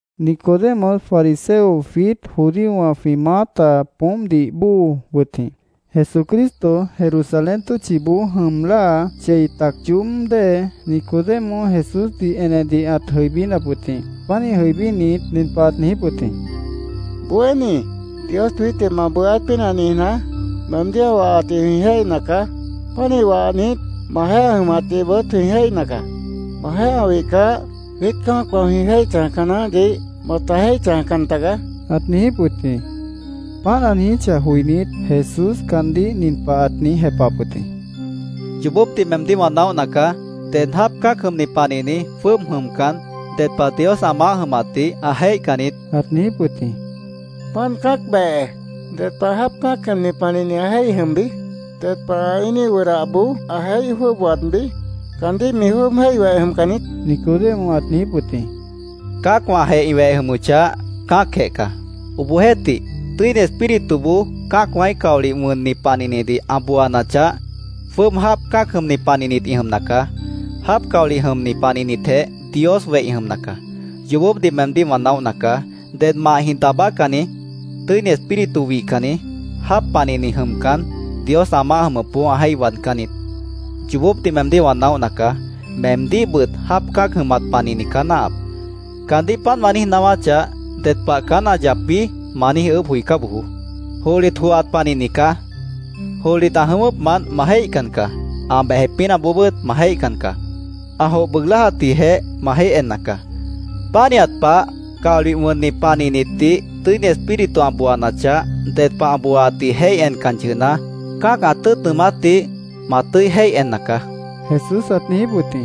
Nicodemo, fariseo, jwiít judíowã jwĩ maáta poómpdih bóo wʉt jĩ. Jesucristo Jerusalén tʉ́tchiboó jʉm láa, chei tac yoób dée, Nicodemo Jesúsdih enedih ãt jʉibínap wʉt jĩ. Pánih jʉibínit, nin pah ãt niijíp wʉt jĩ: —Bohéní, Dios jwiítdih ma bohéát pínah niijná, meemdíh ã wahatdih jwĩ jéihna caá. Pánih wahnit, majeéh ã jʉmatdihbʉt jwĩ jéihna caá. Majeéh ã wihcah, jwiít cã́acwã jwĩ jéih chãjca naáhdih mata jéih chãjcan tagaá, ãt niijíp wʉt jĩ. Páant ã niijíchah joinít, Jesús caandíh nin pah ãt niíj jepahap wʉt jĩ: —Yoobópdih meemdíh wã naóhna caá. Ded jáap cã́ac jʉmni panihni jwʉ́ʉb jʉmcan, ded pah Dios ã maáh jʉmatdih ã jéihcan niít, ãt niijíp wʉt jĩ. —Páant cã́ac behe ¿ded pah jáap cã́ac jʉmni panihni ã jéih jwʉ́ʉb jʉmbi? ¿Ded pah ã íiníh wʉdahboó ã jéih jwʉ́ʉb waadbí? ¿Caandíh mi jwʉ́ʉb jéih weh jʉmca niít? Nicodemo ãt niijíp wʉt jĩ. —Cã́acwãjeh ĩ weh jʉmʉchah, cã́acjeh caá. Obohjeéhtih, Tʉ́ini Espírituboó cã́acwãíh caolih wʉnni panihnidih ã booanachah, jwʉ́ʉb jáap cã́ac jʉmni panihnit ĩ jʉmna caá. Jáap caolih jʉmni panihnitjeh Dios weh ĩ jʉmna caá. Yoobópdih meemdíh wã naóhna caá. Ded mahjĩh daabácanni, Tʉ́ini Espíritu wihcanni, jáap panihni jʉmcan, Dios ã maáh jʉmʉpboó ã jéih waadcán niít. Yoobópdih meemdíh wã naóhna caá: Meemdíhbʉt jáap cã́ac jʉmat panihni caá náahap. Caandíh páant wã niíj naáwáchah, ‘¿Ded pah caán ã yapbi?’ ma niíj ʉʉ́bh joicá bojoó. Johlit johat panihni caá. Johlit ã jʉ̃ʉ́wʉ́pmant ma jéihcan caá. Ã bejep pínahboobʉ́t ma jéihcan caá. Ã joh bʉʉg láajatdihjeh ma jéih enna caá. Pánihat pah, caolih wʉnni panihnitdih Tʉ́ini Espíritu ã booanachah, ded pah ã booaatdih jéih encan yʉhna, cã́ac ã tʉ́ʉt nʉʉmátdih ma tʉ́i jéih enna caá, Jesús ãt niijíp wʉt jĩ.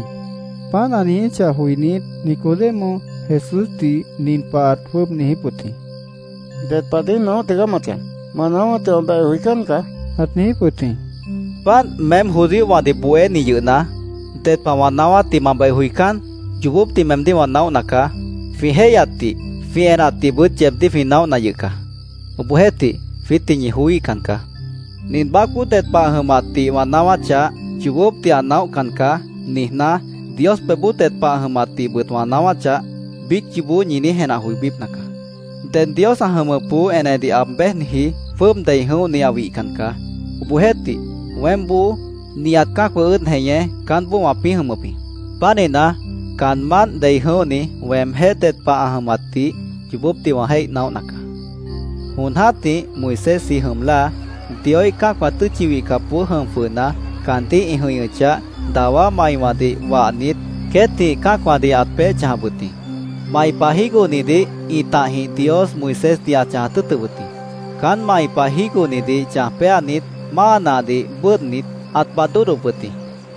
Páant ã niijíchah joinít, Nicodemo Jesúsdih nin pah ãt jwʉ́ʉb niijíp wʉt jĩ: —¿Ded pah niíj naóh tigaá ma chãj? Ma naáwátdih wã beh joicán caá, ãt niijíp wʉt jĩ. —¿Páant, meém judíowãdih bohéni yʉhna, ded pah wã naáwátdih ma beh joicán? Yoobópdih meemdíh wã naóhna caá. Jwĩ jéihyatdih, jwĩ enatdihbʉt yeebdíh jwĩ naóhna yʉh caá. Obohjeéhtih, jwiítdih ñi joííhcan caá. Nin baácboó ded pah ã jʉmatdih wã naáwáchah, ‘Yoobópdih ã naóhcan caá’, niijná, Dios pebhboó ded pah ã jʉmatdihbʉt wã naáwáchah, biíc yoobó ñi niíj jenah joibípna caá. “Ded Dios ã jʉmʉpboó enedih aab béjniji jwʉ́ʉb dei jʉ̃óhni ã wihcan caá. Obohjeéhtih, weémboó, nihat cã́acwã ʉ́ʉd jeñé, caánboó wãpĩ́ jʉmʉp jĩ. Pánihna, caanmánt dei jʉ̃óhni weemjéh ded pah ã jʉmatdih yoobópdih wã jéih naóhna caá. Jon jã́tih, Moisésji jʉm láa, Dioíh cã́acwã tʉ́tchi wihcapboó jʉm jwʉhna, caandíh ĩ jʉ̃ihñʉchah, dawá maiwãdih wahnit, queétjĩh cã́acwãdih ãt peéh chãjap wʉt jĩ. Mai pah jígohnidih ĩtahjĩh Dios Moisésdih ãt chãjat tʉ́ʉtʉp wʉt jĩ. Caán mai pah jígohnidih chãj péanit, máa nahdih bʉ́ʉdhnit, ãt baad dódhdop wʉt jĩ.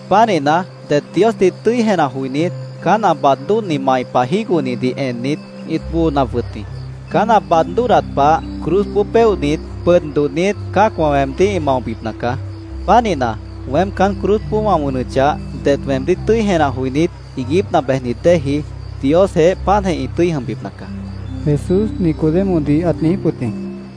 Pánihna, det Diosdih tʉ́i jenah joinít, caán ã baad dódhni mai pah jígohnidih ennit, ĩt boonap wʉt jĩ.Caán ã baad dódhdat pah, cruzboó péohnit, pʉd dodhnit, cã́acwã weemdíh ĩ maobipna caá.Pánihna, weém caán cruzboó wã wʉnʉchah, det weemdíh tʉ́i jenah joinít, iiguípna bejnit déeji Diosjeéh páantjeh ĩ tʉ́i jʉmbipna caá”, Jesús Nicodemodih ãt niijíp wʉt jĩ.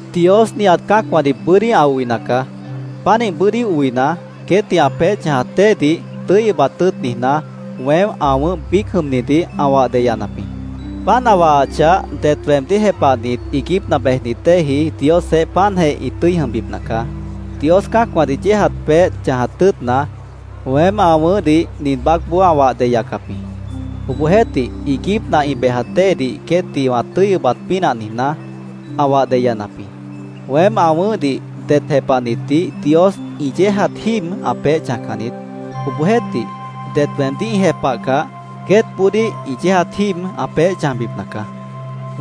“Dios nihat cã́acwãdih bʉ́dí ã oina caá. Pánih bʉ́dí oina, queétdih ã peéh chãjat déedih tʉ́i ʉbat tʉ́ʉt niijná, weém ã wʉ̃ʉ́h biíc jʉmnidih ã wah deyanap jĩ. Páant ã wahachah, det weemdíh jepahnit iiguípna bejnit déeji Diosjeéh páantjeh ĩ tʉ́i jʉmbipna caá. Dios cã́acwãdih yéejat peéh chãjat tʉ́ʉtna, weém ã wʉ̃ʉ́hdih nin baácboó ã wah deyacap jĩ. Obohjeéhtih, iiguípna ĩ bejat déedih queétdih wã tʉ́i ʉbat pínah niijná, ã wah deyanap jĩ. “Weém ã wʉ̃ʉ́hdih det jepahnitdih Dios ĩ yéejat jíib ã peéh chãjcan niít. Obohjeéhtih, det weemdíh ĩ jepahcah, queétboodíh ĩ yéejat jíib ã peéh chãjbipna caá.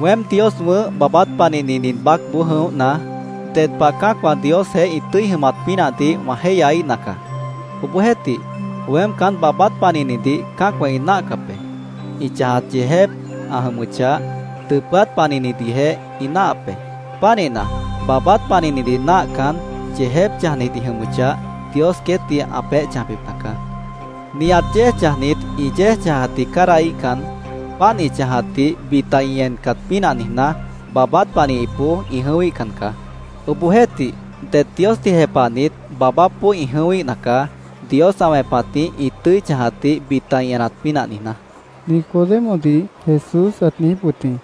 Weém Dios wʉ̃ʉ́h baabát panihni nin baácboó jʉ̃óhna, ded pah cã́acwã Diosjeéh ĩ tʉ́i jʉmat pínahdih wã jéihyaíhna caá. Obohjeéhtih, weém caán baabát panihnidih cã́acwã ĩ náahcap be. Ĩ chãjat yeejép ã jʉmʉchah, dʉpʉ́át panihnidihjeh ĩ náahap be. Pánihna, baabát panihnidih náahcan, yeejép chãjnit ĩ jʉmʉchah, Dios queétdih ã peéh chãjbipna caá. Nihat yéej chãjnit ĩ yéej chãjatdih cádahíhcan, páant ĩ chãjatdih bita ĩ encat pínah niijná, baabát panihipboó ĩ jʉ̃ʉ́wíhcan caá. Obohjeéhtih, det Diosdih jepahnit baabápboó ĩ jʉ̃ʉ́wíhna caá, Dios ã wẽpatjĩh ĩ tʉ́i chãjatdih bita ĩ enat pínah niijná”, Nicodemodih Jesús ãt niijíp wʉt jĩ.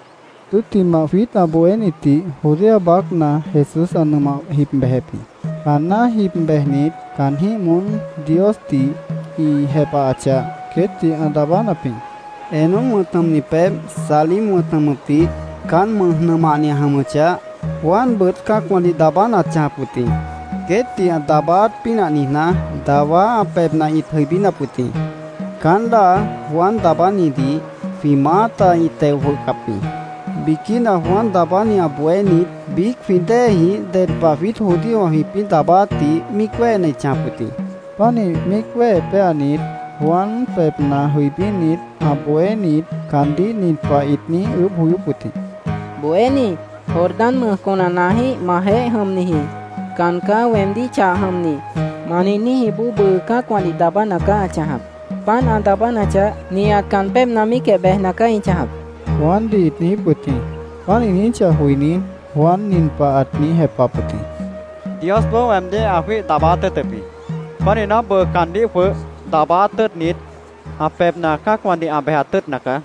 Tʉ́ttimah, jwiít ã bohénitdih Judea baácna Jesús ã nʉmah jib bejep jĩ. Caanná jib bejnit, caanjĩ́h moón Diosdih ĩ jepahachah, queétdih ã daabánap jĩ. Enón wʉ̃t jʉmni pebh Salim wʉ̃t jʉmʉpdih caan mʉ́j nʉmahni ã jʉmʉchah, Juanbʉt cã́acwãdih daabána ãt chãjap wʉt jĩ. Queétdih ã daabáát pínah niijná, dawá ã pebhna ĩt jʉibínap wʉt jĩ. Caán láa Juan Daabánidih jwĩ maáta ĩ teo jwʉhcap jĩ. Biquína Juan Daabáni ã bohénit biíc jwĩ déejĩh ded pah jwiít judíowã jwĩpĩ́ daabáátdih míic wéhena ĩt chãjap wʉt jĩ. Pánih míic wéhe péanit, Juan pebhna jʉibínit, ã bohénit caandíh nin pah ĩt niíj ʉʉ́bh joyóp wʉt jĩ: —Bohéní, Jordán mʉj conanaajĩ́h majeéh jʉmniji ‘Caán caá weemdíh chah jʉmni’, ma niijníjiboó bʉʉ cã́acwãdih daabána caá ã chãjap. Páant ã daabánachah, nihat caan pébhna míicjeh bejna caá ĩ chãjap, Juandih ĩt niijíp wʉt jĩ. Páant ĩ niijíchah joinít, Juan nin pah ãt niíj jepahap wʉt jĩ: —Diosboó weemdíh ã jwíih daabáát tʉ́ʉtʉp jĩ. Pánihna, bʉʉ caandíh jwʉh daabáát tʉ́ʉtnit, ã pebhna cã́acwãdih ã bejat tʉ́ʉtna caá.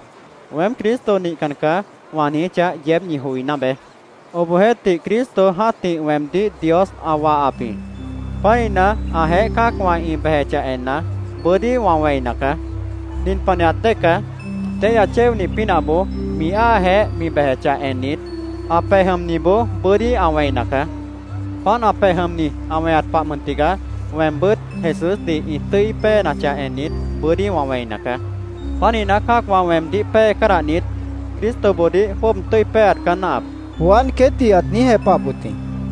‘Weém Cristo nihcan caá’, wã niijíchah, yeéb ñi joiná beé. Obohjeéhtih, Cristo jã́tih weemdíh Dios ã wahap jĩ. Pánihna, ãjeéh cã́acwã ĩ bejechah enna, bʉ́dí wã wẽina caá. Nin panihat dée caá: Téihya chéonih pínahboó mi áajeéh mi bejechah ennit, ã pej jʉmniboó bʉ́dí ã wẽina caá. Páant ã pej jʉmni ã weñat pah mʉn tigaá, weembʉ́t Jesúsdih ĩ tʉ́i péenachah ennit, bʉ́dí wã wẽina caá. Pánihna, cã́acwã weemdíh pée cádahnit, Cristoboodíh jwʉ́ʉb tʉ́i péeat caá náahap, Juan queétdih ãt niíj jepahap wʉt jĩ.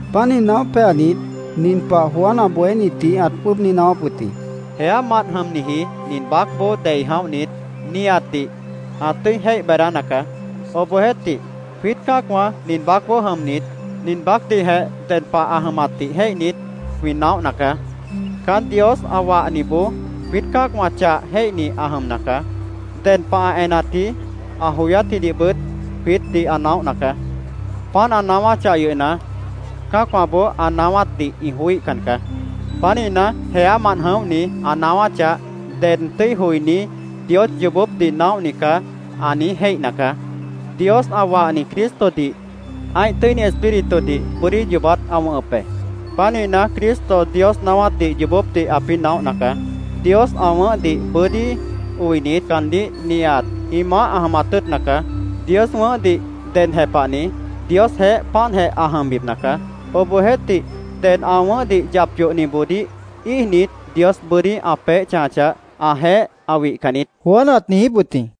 Páant niíj naóh péanit, nin pah Juan ã bohénitdih ãt jwʉ́ʉb niíj naáwáp wʉt jĩ: “Jeámant jʉmniji nin baácboó dei jʉ̃óhni nihatdih ã tʉ́i jéih beedána caá. Obohjeéhtih, jwiít cã́acwã nin baácboó jʉmnit, nin baácdihjeh ded pah ã jʉmatdih jéihnit, jwĩ naóhna caá. Caán Dios ã wahniboó jwiít cã́acwã chah jéihni ã jʉmna caá. Ded pah ã enatji, ã joyátjidihbʉt jwiítdih ã naóhna caá. Páant ã naáwáchah yʉhna, cã́acwãboó ã naáwátdih ĩ joííhcan caá. Pánihna, jeámant jʉ̃óhni ã naáwáchah, ded tʉ́i joiní ‘Dios yoobópdih naóhni caá’, ã niíj jéihna caá. Dios ã wahni Cristodih ã́ih Tʉ́ini Espíritudih bʉ́dí yoobát ã wʉ̃hʉp be. Pánihna, Cristo Dios naáwátdih yoobópdih ãpĩ́ naóhna caá. Dios ã wʉ̃ʉ́hdih bʉ́dí oinit, caandíh nihat ĩ maáh ã jʉmat tʉ́ʉtna caá. Dios wʉ̃ʉ́hdih ded jepahni Diosjeéh páantjeh ã jʉmbipna caá. Obohjeéhtih, ded ã wʉ̃ʉ́hdih yap yohniboodíh íijnit, Dios bʉ́dí ã peéh chãjachah, ãjeéh ã wihcan niít”, Juan ãt niijíp wʉt jĩ.